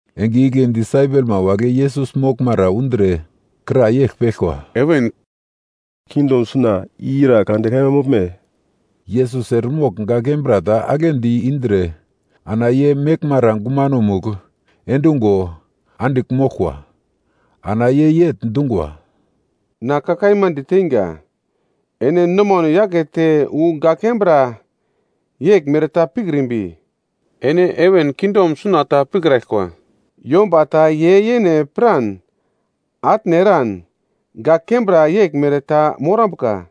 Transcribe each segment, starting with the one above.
Enge igle disaipelma wagle Yesus moglmara undre kra yegl peglkwa, “Heven kingdom suna ira kande kaima moglme?” Yesus eremogl gak kembra ta aglendi indre ana ye meglmara gumanomugl endungo andigl moglkwa. Ana ye yegl dungwa, “Na ka kaima diteinga, ene nomano yakete wu gak kembra yeglmere ta pikrimbi, ene heven kingdom suna ta pikraglkwa. Yomba ta ye yene piran atne eran gak kembra yeglmere ta morambuka,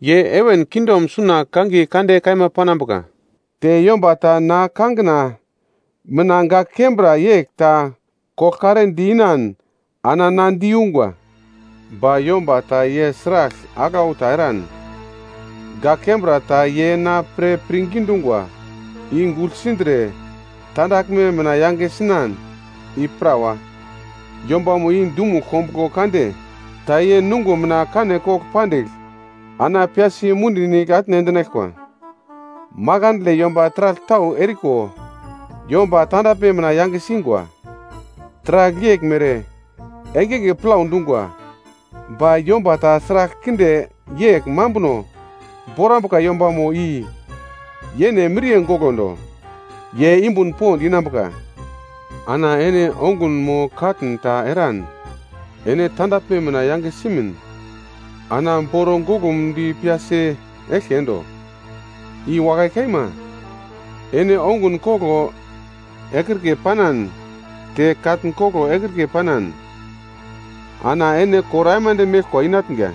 ye heven kingdom suna kangiye kande kaima panambuka. Te yomba ta na kangina mina gak kembra yegl ta koglkare di-inan, ana na diyungwa. “Ba yomba ta ye sragl aglau ta eran, gak kembra ta ye na pre pirngi dungwa i gugl sindre tandaglme mina yange sinan i prawa, yombamo i dumugl kombuglo kande ta ye nungo mina kane kogl pandigl ana piyasi mundi nigl atne endinaglkwa. “Makandle yomba taragl tau eriko yomba tandaglme mina yange singwa. Taragl yeglmere engenge plau dungwa. Ba yomba ta sragl kinde yegl mambuno borambuka yombamo i yene miriye golondo. Ye yumbun pond inambuka. Ana ene ongun mo katn ta eran ene tandaglme mina yange simin, ana boro goglumdi piyasi eglke endo. I wakai kaima, ene ongun koglo ekrike panan te katn koglo ekrike panan, ana ene kor aimande meglkwa inatnga,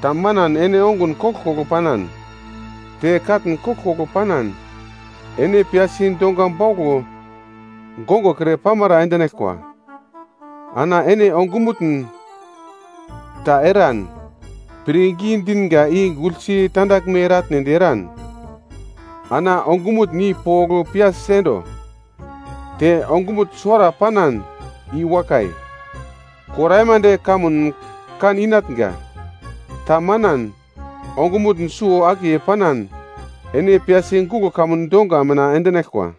ta manan ene ongun koglkoglo panan, te katn koglkoglo panan ene piyasi donga bauglo gongokre pamara endinaglkwa. Ana ene ongumutn ta eran pirngi dinga i guglsi tandaglme eratnedi eran, ana ongumutn i pogl piyasi endo. Te ongumutn suwara panan i wakai, kor aimande kamun kan inatnga. Tamanan ongumutn suwo-akiye panan ene piyasi guglo kamun donga mina endinaglkwa.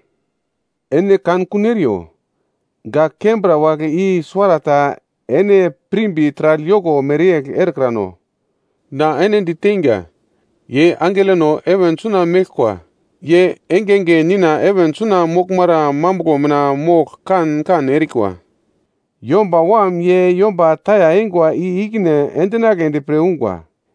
“Ene kankun eriyo; gak kembra wagle i suwarata ene pirmbi taragl yoko mere erekrano. Na ene diteinga, ye angelono heven suna meglkwa ye engenge Nina heven suna moglmara mambuglo mina mogl kan kan erikwa. Yomba Wam ye yomba taya eingwa i i-ikine endinagledi pre ungwa.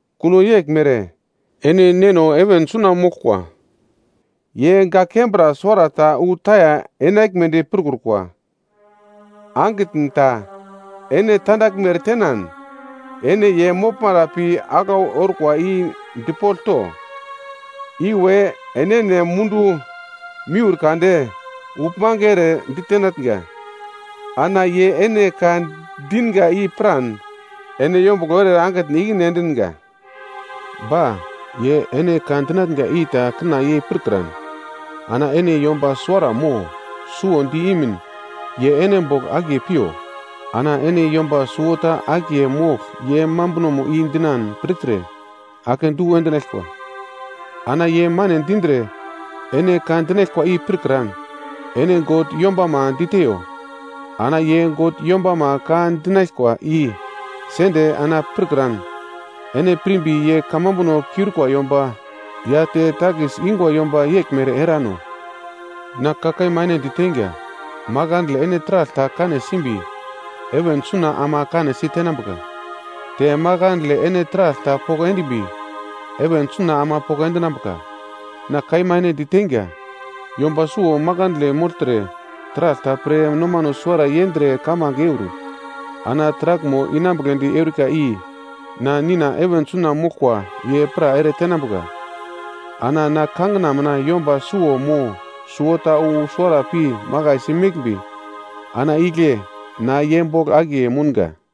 Kuno yeglmere ene Neno heven suna moglkwa ye gak kembra suwarata wu taya enaglmedi pirkrukwa. “Angitn ta ene tandaglme eretenan, ene ye moglmara pi aglau orkwa i dipogl to. Iwe enene mundu miur kade uglmange ere ditenatnga. Ana ye ene ka dinga i piran, ene yombuglo ere angitn i-ikine endinga. Ba ye ene ka dinatnga i ta kina yei pirkran, ana ene yomba suwara mo suwo di imin ye ene bogl akiye piyo. Ana ene yomba suwota akiye mogl ye mambunomo i dinan pirtre, akedu endinaglkwa. Ana ye mane dindre ene ka dinaglkwa i pirkran, ene God yombama diteyo. Ana ye God yombama ka dinaglkwa i sende ana pirkran, ene pirmbi ye kamambuno kiurikwa yomba ya te takis ingwa yomba yeglmere erano. “Na ka kaima ene diteinga, makandle ene taragl ta kane simbi, heven suna ama kanesi tenambuka. Te makandle ene taragl ta poko endimbi, heven suna ama poko endinambuka. “Na kaima ene diteinga, yomba suwo makandle mogltre taragl ta pre nomano suwara yendre kamange eur, ana taraglmo inambugledi eurika i na Nina heven suna moglkwa ye pra eretenambuka. Ana na kangina mina yomba suwo mo suwota wu suwara pi makaisi meglmbi, ana igle na ye bogl akiye mounga.”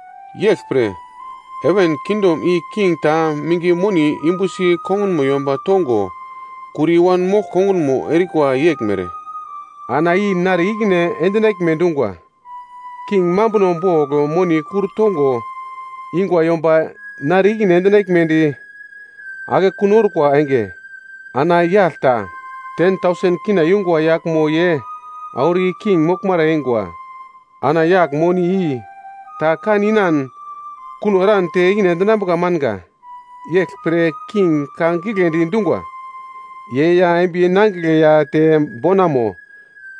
“Yeglpre, heven kingdom i king ta minge monimo yumbusi kongunmo yomba tongo kur i-wanmogl kongunmo erikwa yeglmere, ana i nare ikine endinaglme dungwa. King mambuno bogl moni kur tongo ingwa yomba nare ikine endinaglmedi akekun orkwa enge, ana yagl ta K10,000 yungwa yaglmo ye auro i king moglmara eingwa. Ana yagl moni i ta kan inan kuno eran te ikine endinambuka manga. Yeglpre king ka giglendi dungwa, ye ya embiye nangigle ya te bonamo,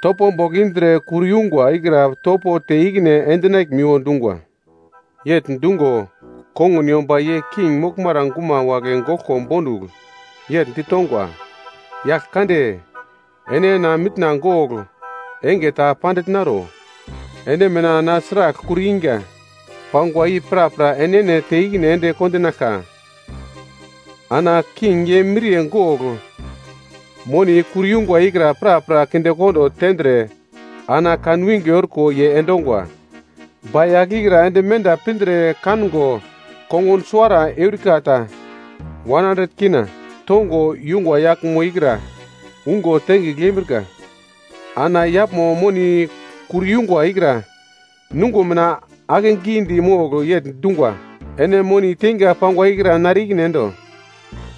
topo bogl indre kur yungwa ikra topo te ikine endinaglmiwo dungwa. “Yegl dungo kongun yomba ye king moglmara guma wagle goglko bondugl yegl ditongwa, ‘Yagl kande, ene na mitna gogl enge ta pandigl naro, ene mina na sragl kur inga pangwa i prapra enene te ikine ende kondinaglka.’ Ana king ye miriye gogl moni kur yungwa ikra prapra kindekondo tendre ana kan winge orko ye endongwa. “Ba yagl ikra ende menda pindre kango kongun suwara eurika ta K1.00 tongo yungwa yaglmo ikra ungo tengigl yembrika. Ana yaglmo moni kur yungwa ikra nungo mina akegidi mogl yegl dungwa, ‘Ene moni teinga pangwa ikra nare ikine endo!’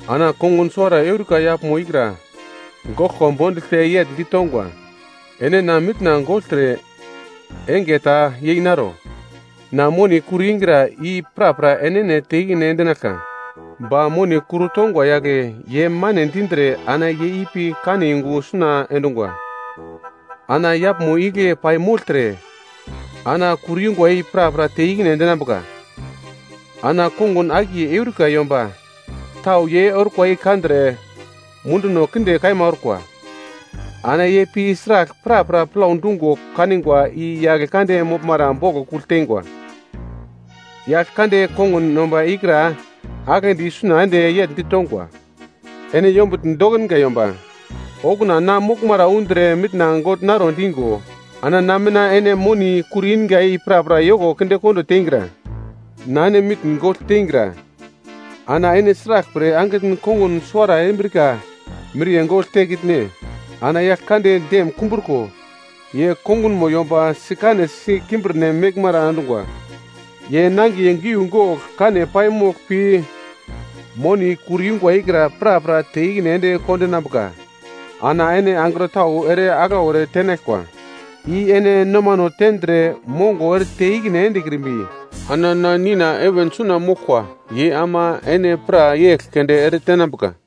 “Ana kongun suwara eurika yaglmo ikra goglko bonduglte yegl ditongwa, ‘Ene na mitna gogltre enge ta yei naro. Na moni kur ingra i prapra enene te ikine endinaglka.’ “Ba moni kur tongwa yagle ye mane dindre ana ye ipi kane yungu suna endungwa. Ana yaglmo igle pai mogltre ana kur yungwa i prapra te ikine endinambuka. Ana kongun akiye erikwa yomba tau ye orkwa i kandre munduno kinde kaima orkwa. Ana ye pi sragl prapra plau dungo kanigwa i yagl kande moglmara boglo kugl teingwa. “Yagl kande kongun yomba ikra aglendi isuna ende yegl ditongwa, ‘Ene yombutn dokinga yomba, okuna na moglmara undre mitna gogl naro dingo, ana na mina ene moni kur inga i prapra yoko kindekondo teingra. Na ene mitn gogl teingra. Ana ene sraglpre angitn kongun suwara erimbrika miriye gogl tekitne?’ Ana yagl kande dem kumbruko, ye kongunmo yomba sikanesi kimbirnem meglmara endungwa. Ye nangiye giugogl kane paimogl pi moni kur yungwa ikra prapra te ikine ende kondinambuka. “Ana ene angro tau ere aglau eretenaglkwa i ene nomano tendre mongo erete ikine endekrimbi, ana na Nina heven suna moglkwa ye ama ene prapra yegl keunde ere tenambuka.”